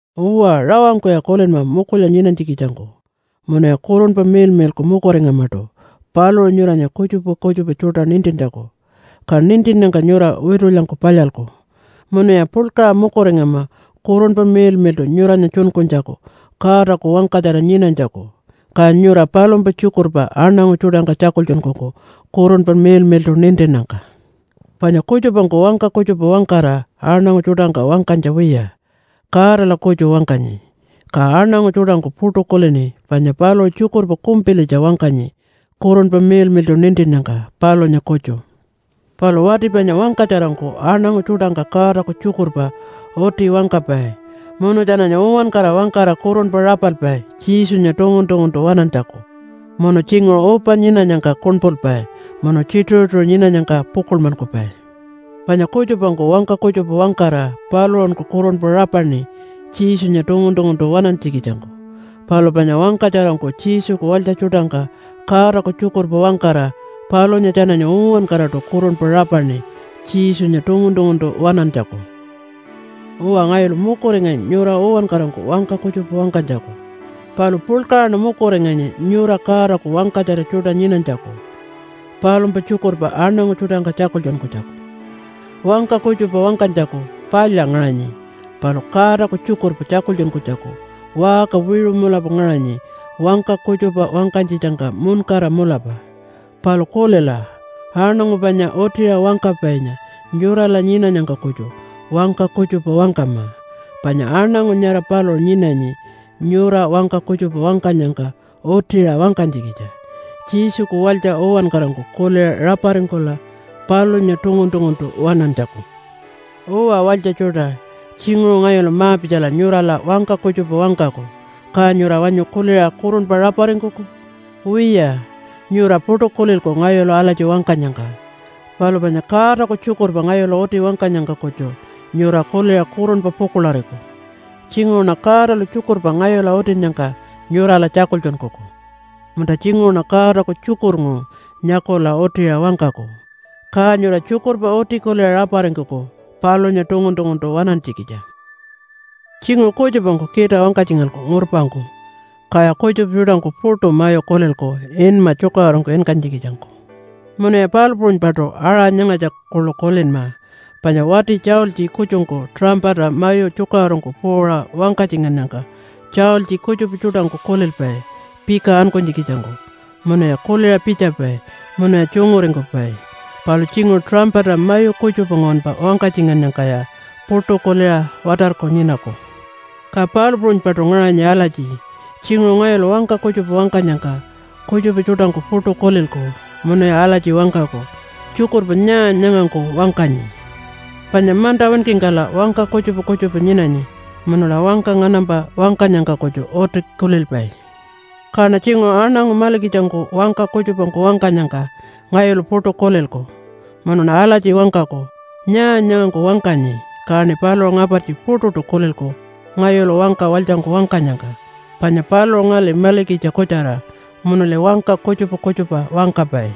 Uwa, rawangkuya kulinma mukulya nyinanytjikitjangku. Munuya Kurunpa Miḻmiḻku mukuringamaṯu paluṟu nyuranya kutjupa kutjupa tjuṯa nintintjaku, ka nintinnyangka nyura witulyangku palyalku. Munuya puḻkaṟa mukuringama Kurunpa Miḻmiḻṯu nyuranya tjunkunytjaku Godaku wangkatjara nyinanytjaku, ka nyura palumpa tjukurpa aṉangu tjuṯangka tjakultjunkuku Kurunpa Miḻmiḻṯu nintinnyangka. Panya kutjupangku wangka kutjupa wangkara aṉangu tjuṯangka wangkanytja wiya, Godala kutju wangkanyi. Ka aṉangu tjuṯangku puṯu kulini panya paluṟu tjukurpa kumpilitja wangkanyi Kurunpa Miḻmiḻṯu nintinnyangka palunya kutju. Palu wati panya wangkatjarangku aṉangu tjuṯangka Godaku tjukurpa uti wangkapai, munu tjananya uwankara wangkara kurunpa rapalpai Jesunya tungun-tunguntu waṉantjaku, munu tjinguṟu upa nyinanyangka kuṉpulpai, munu tjituṟu-tjituṟu nyinanyangka pukuḻmankupai. Panya kutjupangku wangka kutjupa wangkara paluṟunku kurunpa rapaṉi Jesunya tungun-tunguntu waṉantjikitjangku. Palu panya wangkatjarangku Jesuku walytja tjuṯangka Godaku tjukurpa wangkara palunya tjananya uwankaraṯu kurunpa rapaṉi Jesunya tungun-tunguntu waṉantjaku. Uwa, ngayulu mukuringanyi nyura uwankarangku wangka kutjupa wangkanytjaku. Palu puḻkaṟaṉa mukuringanyi nyura Godaku wangkatjara tjuṯa nyinanytjaku, palumpa tjukurpa aṉangu tjuṯangka tjakultjunkunytjaku. Wangka kutjupa wangkanytjaku palya ngaṟanyi, palu Godaku tjukurpa tjakultjunkunytjaku waṟka wiṟu mulapa ngaṟanyi wangka kutjupa wangkanytjitjangka muṉkara mulapa. Palu kulila, aṉangu panya utiṟa wangkapainya nyurala nyinanyangka kutju wangka kutjupa wangkama. Panya aṉangu nyara paluṟu nyinanyi nyura wangka kutjupa wangkanyangka utiṟa wangkanytjikitja, Jesuku walytja uwankarangku kuliṟa raparingkula palunya tungun-tunguntu waṉantjaku. Uwa walytja tjuṯa, tjinguṟu ngayulu ma-pitjala nyurala wangka kutjupa wangkaku, ka nyura wanyu kuliṟa kurunpa raparingkuku? Wiya, nyura puṯu kulilku ngayulu alatji wangkanyangka. Palu panya Godaku tjukurpa ngayulu uti wangkanyangka kutju nyura kuliṟa kurunpa pukuḻariku. Tjinguṟuṉa Godalu tjukurpa ngayula utinnyangka nyurala tjakultjunkuku, munta tjinguṟuṉa Godaku tjukurnguṟu nyakula utiṟa wangkaku. Ka nyura tjukurpa uti kuliṟa raparingkuku palunya tungun-tunguntu waṉantjikitja. Tjinguṟu kutjupangku kita wangkatjingalku ngurpangku, kaya kutjupa tjuṯangku puṯu mayu kulilku inma tjukaṟurungku inkanytjikitjangku. Munuya palu puṟunypaṯu aṟa nyangatja kuḻu kulinma. Panya wati tjaultji kutjungku tuṟampata mayu tjukaṟurungku puuṟa wangkatjingannyangka tjaultji kutjupa tjuṯangku kulilpai pika ankunytjikitjangku munuya kuliṟa pitjapai munuya tjunguringkupai. Palu tjinguṟu tuṟampata mayu kutjupa nguwanpa wangkatjingannyangkaya puṯu kuliṟa watarku nyinaku. Ka palu puṟunypaṯu ngaṟanyi alatji, tjinguṟu ngayulu wangka kutjupa wangkanyangka kutjupa tjuṯangku puṯu kulilku munuya alatji wangkaku, “Tjukurpa nyaa nyangangku wangkanyi?” Panya manta winkingkala wangka kutjupa kutjupa nyinanyi, munula wangka nganampa wangkanyangka kutju uti kulilpai. Kaṉa tjinguṟu aṉangu malikitjangku wangka kutjupangku wangkanyangka ngayulu puṯu kulilku, munuṉa alatji wangkaku, “Nyaa nyangangku wangkanyi?” Kaṉi paluṟu ngapartji puṯuṯu kulilku ngayulu wangka walytjangku wangkanyangka, panya paluṟu ngali malikitja kutjara munuli wangka kutjupa kutjupa wangkapai.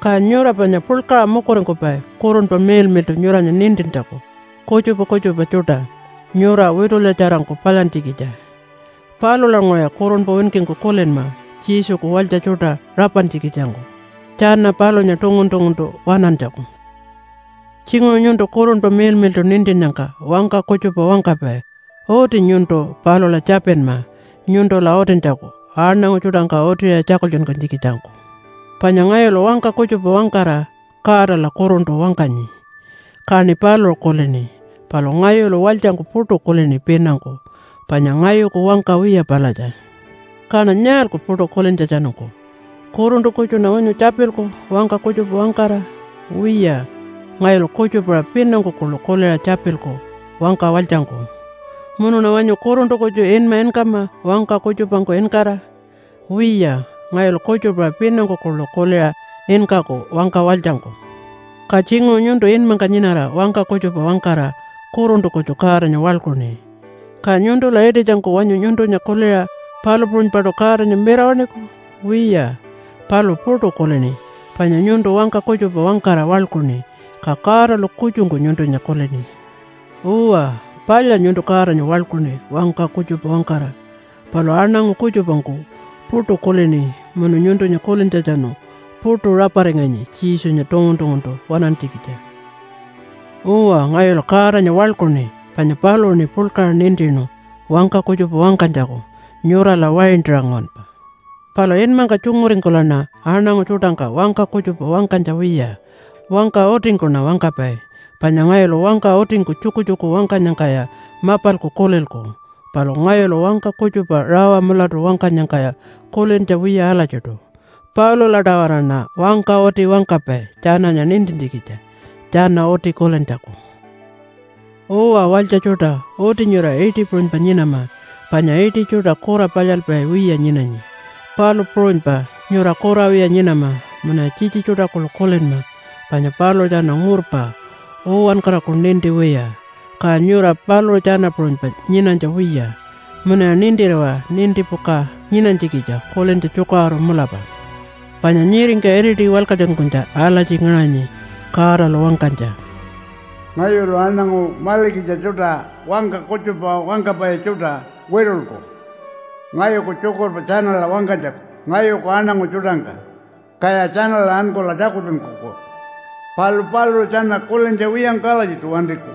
Ka nyura panya puḻkaṟa mukuringkupai Kurunpa Miḻmiḻṯu nyuranya nintintjaku kutjupa kutjupa tjuṯa nyura witulyatjarangku palyantjikitja. Palulanguṟuya kurunpa winkingku kulinma Jesuku walytja tjuṯa rapantjikitjangku tjana palunya tungun-tunguntu waṉantjaku. Tjinguṟu nyuntu Kurunpa Miḻmiḻṯu nintinnyangka wangka kutjupa wangkapai. Uti nyuntu palula tjapinma nyuntula utintjaku aṉangu tjuṯangka utiṟa tjakultjunkunytjikitjangku. Panya ngayulu wangka kutjupa wangkara Godala kuruntu wangkanyi, kaṉi paluṟu kulini. Palu ngayulu walytjangku puṯu kulini pinangku, panya ngayuku wangka wiya palatja. Kaṉa nyaalku puṯu kulintjatjanungku? Kuruntu kutjuṉa wanyu tjapilku wangka kutjupa wangkara? Wiya, ngayulu kutjupa-aṟa pinangku kuḻu kuliṟa tjapilku wangka walytjangku. Munuṉa wanyu kuruntu kutju inma inkama wangka kutjupangku inkara? Wiya ngayulu kutjupa-aṟa pinangku kuḻu kuliṟa inkaku wangka walytjangku. Ka tjinguṟu nyuntu inmangka nyinara wangka kutjupa wangkara kuruntu kutju Godanya waḻkuṉi. Ka nyuntula ititjangku wanyu nyuntunya kuliṟa palu puṟunypaṯu Godanya mirawaṉiku? Wiya, paluṟu puṯu kulini, panya nyuntu wangka kutjupa wangkara waḻkuṉi, ka Godalu kutjungku nyuntunya kulini. Uwa, palya nyuntu Godanya waḻkuṉi wangka kutjupa wangkara, palu aṉangu kutjupangku puṯu kulini munu nyuntunya kulintjatjanu puṯu raparinganyi Jesunya tungun-tunguntu waṉantjikitja. Uwa, ngayulu Godanya waḻkuṉi, panya paluṟuṉi puḻkaṟa nintinu wangka kutjupa wangkanytjaku nyurala waintaṟa nguwanpa. Palu inmangka tjunguringkulaṉa aṉangu tjuṯangka wangka kutjupa wangkanytja wiya, wangka utingkuṉa wangkapai. Panya ngayulu wangka utingku tjukutjuku wangkanyangkaya mapalku kulilku, palu ngayulu wangka kutjupa rawa mulatu wangkanyangkaya kulintja wiya alatjiṯu. Palula-tawaraṉa wangka uti wangkapai tjananya nintintjikitja, tjana uti kulintjaku. Uwa walytja tjuṯa, uti nyura iṯi puṟunypa nyinama panya iṯi tjuṯa kura palyalpai wiya nyinanyi, palu puṟunypa nyura kura wiya nyinama. Munuya tjitji tjuṯa kuḻu kulinma panya paluṟu tjana ngurpa, uwankaraku ninti wiya, ka nyura paluṟu tjana puṟunypa nyinanytja wiya, munuya nintiriwa nintipuka nyinanytjikitja kulintja tjukaṟuru mulapa. Panya nyiringka iriti walkatjunkunytja alatji ngaṟanyi Godalu wangkanytja, “Ngayulu aṉangu malikitja tjuṯa wangka kutjupa wangkapai tjuṯa witulku ngayuku tjukurpa tjanala wangkanytjaku ngayuku aṉangu tjuṯangka, kaya tjanala ankula tjakultjunkuku. Palu paluṟu tjana kulintja wiyangku alatjiṯu wantiku.”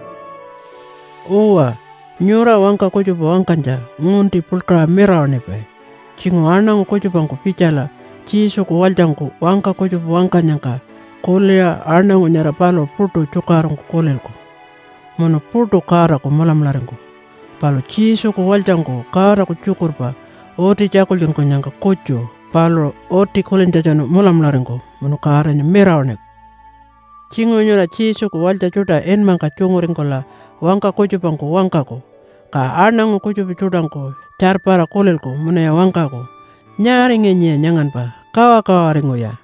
Uwa, nyura wangka kutjupa wangkanytja ngunti puḻkaṟa mirawaṉipai. Tjinguṟu aṉangu kutjupangku pitjala Jesuku walytjangku wangka kutjupa wangkanyangka kuliṟa aṉangu nyara paluṟu puṯu tjukaṟurungku kulilku, munu puṯu Godaku mulamularingkuku. Palu Jesuku walytjangku Godaku tjukurpa uti tjakultjunkunyangka kutju paluṟu uti kulintjatjanu mulamularingkuku munu Godanya mirawaṉiku. Tjinguṟu nyura Jesuku walytja tjuṯa inmangka tjunguringkula wangka kutjupangku wangkaku, ka aṉangu kutjupa tjuṯangku tjarpara kulilku munuya wangkaku, “Nyaaringanyiya nyanganpa? Kawakawaringuya.”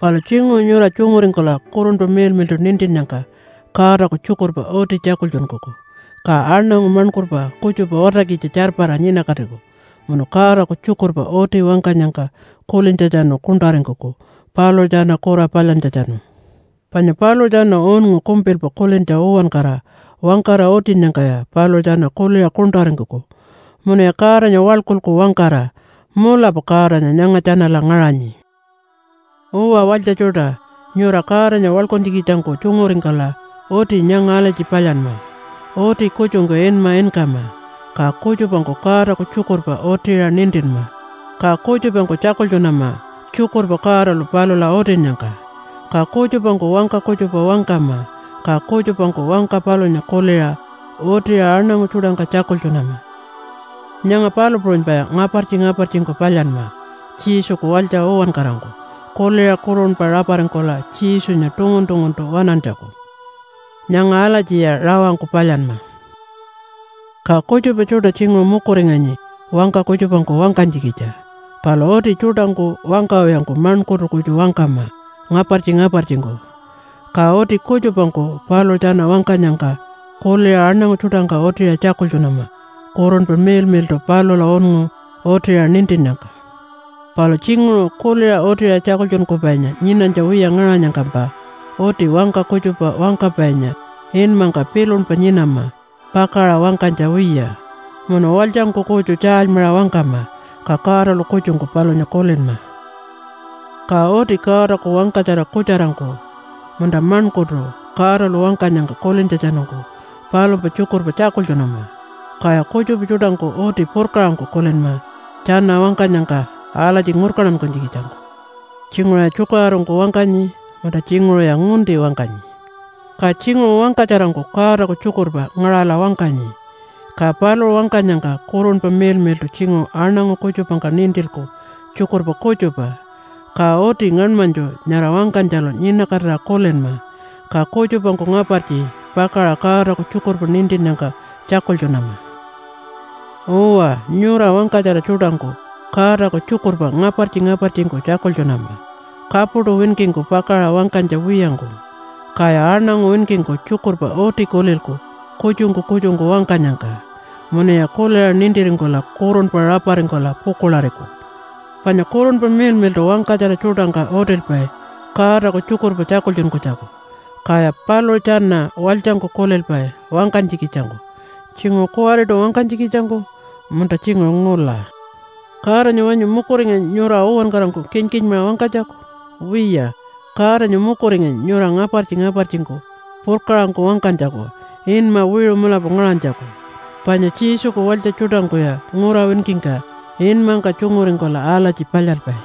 Palu tjinguṟu nyura tjunguringkula Kurunpa Miḻmiḻṯu nintinnyangka Godaku tjukurpa uti tjakultjunkuku, ka aṉangu maṉkurpa kutjupa watarkitja tjarpara nyinakatiku munu Godaku tjukurpa uti wangkanyangka kulintjatjanu kuṉṯaringkuku paluṟu tjana kura palyantjatjanu. Panya paluṟu tjana unngu kumpilpa kulintja uwankara wangkara utinnyangkaya paluṟu tjana kuliṟa kuṉṯaringkuku munuya Godanya waḻkulku wangkara, “Mulapa Godanya nyanga tjanala ngaṟanyi.” Uwa walytja tjuṯa, nyura Godanya waḻkuntjikitjangku tjunguringkula uti nyanga alatji palyanma. Uti kutjungku inma inkama. Ka kutjupangku Godaku tjukurpa utiṟa nintinma. Ka kutjupangku tjakultjunama tjukurpa Godalu palula utinnyangka. Ka kutjupangku wangka kutjupa wangkama, ka kutjupangku wangka palunya kuliṟa utiṟa aṉangu tjuṯangka tjakultjunama. Nyanga palu puṟunypaya ngapartji-ngapartjingku palyanma Jesuku walytja uwankarangku kuliṟa kurunpa raparingkula Jesunya tungun-tunguntu waṉantjaku. Nyanga alatjiya rawangku palyanma. Ka kutjupa tjuṯa tjinguṟu mukuringanyi wangka kutjupangku wangkanytjikitja. Palu uti tjuṯangku wangkawiyangku maṉkurtu kutju wangkama ngapartji-ngapartjingku. Ka uti kutjupangku paluṟu tjana wangkanyangka kuliṟa aṉangu tjuṯangka utiṟa tjakultjunama Kurunpa Miḻmiḻṯu palula unngu utiṟa nintinnyangka. Palu tjinguṟu kuliṟa utiṟa tjakultjunkupainya nyinanytja wiya ngaṟanyangkampa uti wangka kutjupa wangkapainya inmangka pilunpa nyinama pakaṟa wangkanytja wiya, munu walytjangku kutju tjaalymaṟa wangkama, ka Godalu kutjungku palunya kulinma. Ka uti Godaku wangkatjara kutjarangku munta maṉkurtu Godalu wangkanyangka kulintjatjanungku palumpa tjukurpa tjakultjunama, kaya kutjupa tjuṯangku uti purkaṟangku kulinma tjana wangkanyangka alatji ngurkantankunytjikitjangku tjinguṟuya tjukaṟurungku wangkanyi munta tjinguṟuya ngunti wangkanyi. Ka tjinguṟu wangkatjarangku Godaku tjukurpa ngaṟala wangkanyi, ka paluṟu wangkanyangka Kurunpa Miḻmiḻṯu tjinguṟu aṉangu kutjupangka nintilku tjukurpa kutjupa. Ka uti ngaṉmanytju nyara wangkanytjalu nyinakatira kulinma, ka kutjupangku ngapartji pakaṟa Godaku tjukurpa nintinnyangka tjakultjunama. Uwa, nyura wangkatjara tjuṯangku Godaku tjukurpa ngapartji-ngapartjingku tjakultjunama, kapuṯu winkingku pakaṟa wangkanytja wiyangku. Kaya aṉangu winkingku tjukurpa uti kulilku kutjungku kutjungku wangkanyangka, munuya kuliṟa nintiringkula kurunpa raparingkula pukuḻariku. Panya Kurunpa Miḻmiḻṯu wangkatjara tjuṯangka utilpai Godaku tjukurpa tjakultjunkunytjaku, kaya paluṟu tjana walytjangku kulilpai wangkanytjikitjangku, tjinguṟu kuwariṯu wangkanytjikitjangku, munta tjinguṟu ngula. Godanya wanyu mukuringanyi nyura uwankarangku kinkinmaṟa wangkanytjaku? Wiya, Godanya mukuringanyi nyura ngapartji-ngapartjingku purkaṟangku wangkanytjaku inma wiṟu mulapa ngaṟanytjaku. Panya Jesuku walytja tjuṯangkuya ngura winkingka inmangka tjunguringkula alatji palyalpai.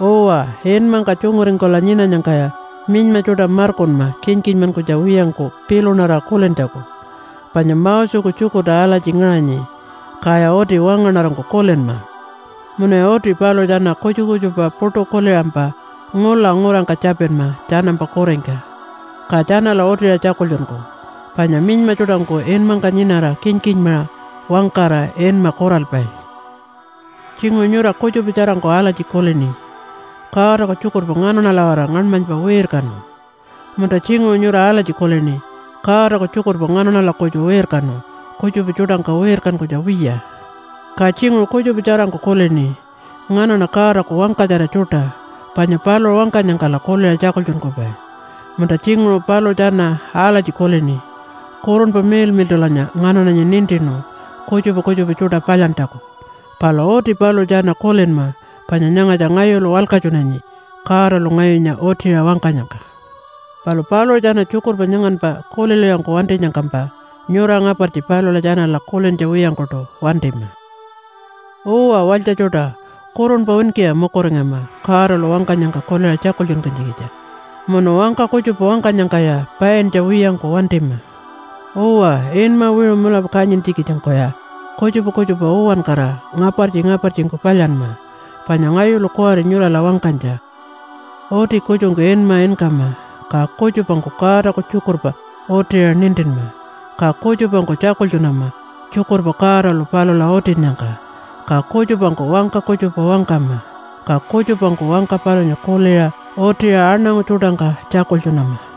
Uwa, inmangka tjunguringkula nyinanyangkaya minyma tjuṯa markunma kinkinmankunytja wiyangku pilunarira kulintjaku, panya Moseku tjukurta alatji ngaṟanyi kaya uti wangaṉarangku kulinma. Munuya uti paluṟu tjana kutjupa kutjupa puṯu kuliṟampa ngula ngurangka tjapinma tjanampa kuringka, ka tjanala utiṟa tjakultjunkuku. Panya minyma tjuṯangku inmangka nyinara kinkinmaṟa wangkara inma kuralpai. Tjinguṟu nyura kutjupa tjarangku alatji kulini, “Godaku tjukurpa nganaṉala-waraṟa ngaṉmanypa wirkanu.” Munta tjinguṟu nyura alatji kulini, “Godaku tjukurpa nganaṉala kutju wirkanu kutjupa tjuṯangka wirkankunytja wiya.” Ka tjinguṟu kutjupa tjarangku kulini, “Nganaṉa Godaku wangkatjara tjuṯa, panya paluṟu wangkanyangkala kuliṟa tjakultjunkupai.” Munta tjinguṟu paluṟu tjana alatji kulini, “Kurunpa Miḻmiḻṯulanya nganaṉanya nintinu kutjupa kutjupa tjuṯa palyantjaku.” Palu uti paluṟu tjana kulinma panya nyangatja ngayulu walkatjunanyi Godalu ngayunya utiṟa wangkanyangka. Palu paluṟu tjana tjukurpa nyanganpa kulilwiyangku wantinyangkampa nyura ngapartji palula tjanala kulintja wiyangkuṯu wantima. Uwa walytja tjuṯa, kurunpa winkiya mukuringama Godalu wangkanyangka kuliṟa tjakultjunkunytjikitja. Munu wangka kutjupa wangkanyangkaya paintja wiyangku wantima. Uwa, inma wiṟu mulapa kanyintjikitjangkuya kutjupa kutjupa uwankara ngapartji-ngapartjingku palyanma, panya ngayulu kuwari nyurala wangkanytja. Uti kutjungku inma inkama. Ka kutjupangku Godaku tjukurpa utiṟa nintinma. Ka kutjupangku tjakultjunama tjukurpa Godalu palula utinnyangka. Ka kutjupangku wangka kutjupa wangkama, ka kutjupangku wangka palunya kuliṟa utiṟa aṉangu tjuṯangka tjakultjunama.